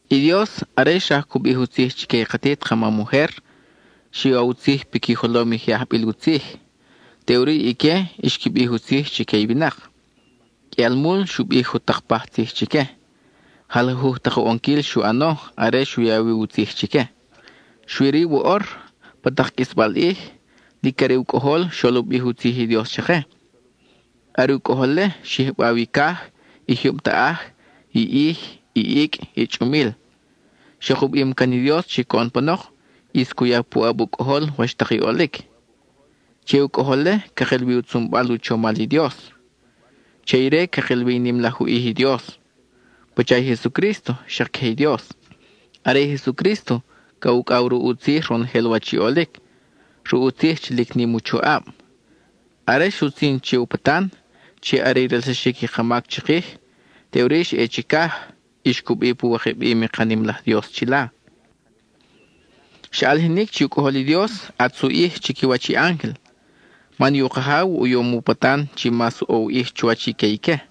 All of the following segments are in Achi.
I Dios, are xraj cu bij u tzij chique i katit ka mam ujer, xu ya u tzij piqui jolom i je ajbil u tzij, teʼuri ique xqui bij u tzij chique i winak. Qʼuialmul xu bij jutak paj tzij chique, jalajuj tak u ʼonquil xu ʼano are xu ya wi u tzij chique. Xui-ri woʼor, pa tak qʼuisbal ʼij, lic are u Cʼojol xol u bij u tzij i Dios chake. Are u Cʼojol-le xyijbaw i caj, i jyub taʼaj, i ʼij, i icʼ, i chʼumil. Xak u bim can i Dios chi coʼon panok, ʼis cu ya puʼab u Cʼojol wach tak i ʼolic. Che i u Cʼojol-le cakil wi u tzunbal u chomal i Dios; che ire cakil wi i nim laj u ʼij i Dios. Pacha i Jesucrísto, xak queje i Dios. Are i Jesucrísto ca ucʼaw ruʼ u tzij ronojel wach i ʼolic, ruʼ u tzij chi lic nim u choʼab. Are xutzin che u patan, chi are i relsaxic i ka mac chikij, teʼuri xa ʼe chicaj, y xcubi pu wikabim i ka nim laj Dios chila. Xa ʼalijinic chi u Cʼojol i Dios, ʼatz u ʼij chiquiwach i ángel, man i u Kajaw u yom u patan chi mas ʼo u ʼij chuwach i que ique.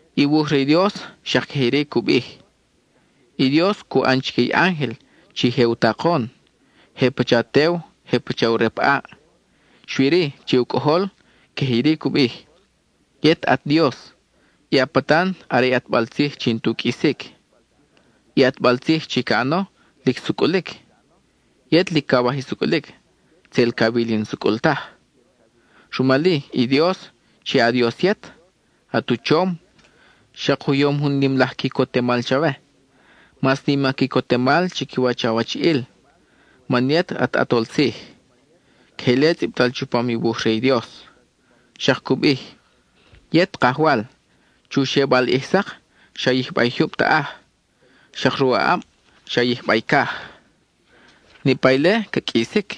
I wuj re i Dios xak queje iri cu bij: I Dios cu ʼan chique i ángel chi je u takon; je pacha tew; je pacha u rep ʼaʼ. Xui-ri, che u Cʼojol, queje iri cu bij: Yet at Dios, i a patan are i ʼatbal tzij chi n-tu qʼuisic. I ʼatbal tzij chi ca ʼano, lic sucʼulic. Yet lic cawaj i sucʼulic, tzel cawil i n-sucʼul taj, rumal-i i Dios, chi a Dios yet, at u chom, xak u yom jun nim laj quicotemal chawe, mas nim a quicotemal chiquiwach awachiʼil, man yet at ʼatol tzij. (Queje ile tzʼibtal chupam i wuj re i Dios.) Xak cu bij: Yet, Kajwal, chu xebal ʼij sak, xa yijba i jyub taʼaj; xak ruʼ a ʼab xa yijba i caj. Niʼpa ile ca qʼuisic,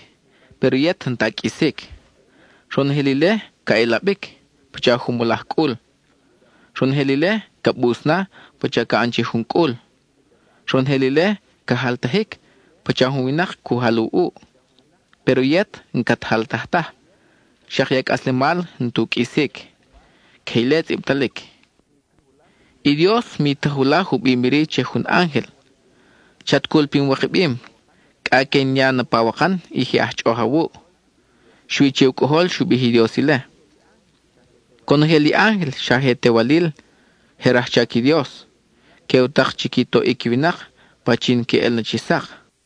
péro yet n-ta a qʼuisic. Ronojel ile ca ʼelabic, pacha jumolaj cʼul. Ronojel ile, ca bus na pacha ca ʼan che jun cʼul; ronojel ile ca jaltajic pacha jun winak cu jal u ʼuʼ. Péro yet n-cat jaltaj taj, xak i a cʼaslemal n-tu qʼuisic. (Queje ile tzʼibtalic.) I Dios mi ta julaj u bim iri che jun ángel: Chat cul pin wikabim, cʼa que in ya na pawakan i je aj chʼoʼoj awuʼ. Xui che u Cʼojol xu bij i Dios ile. Conojel i ángel xa je tewalil, je rajchac i Dios; que u tak chi qui toʼic i winak pachin que ʼel na chi sak.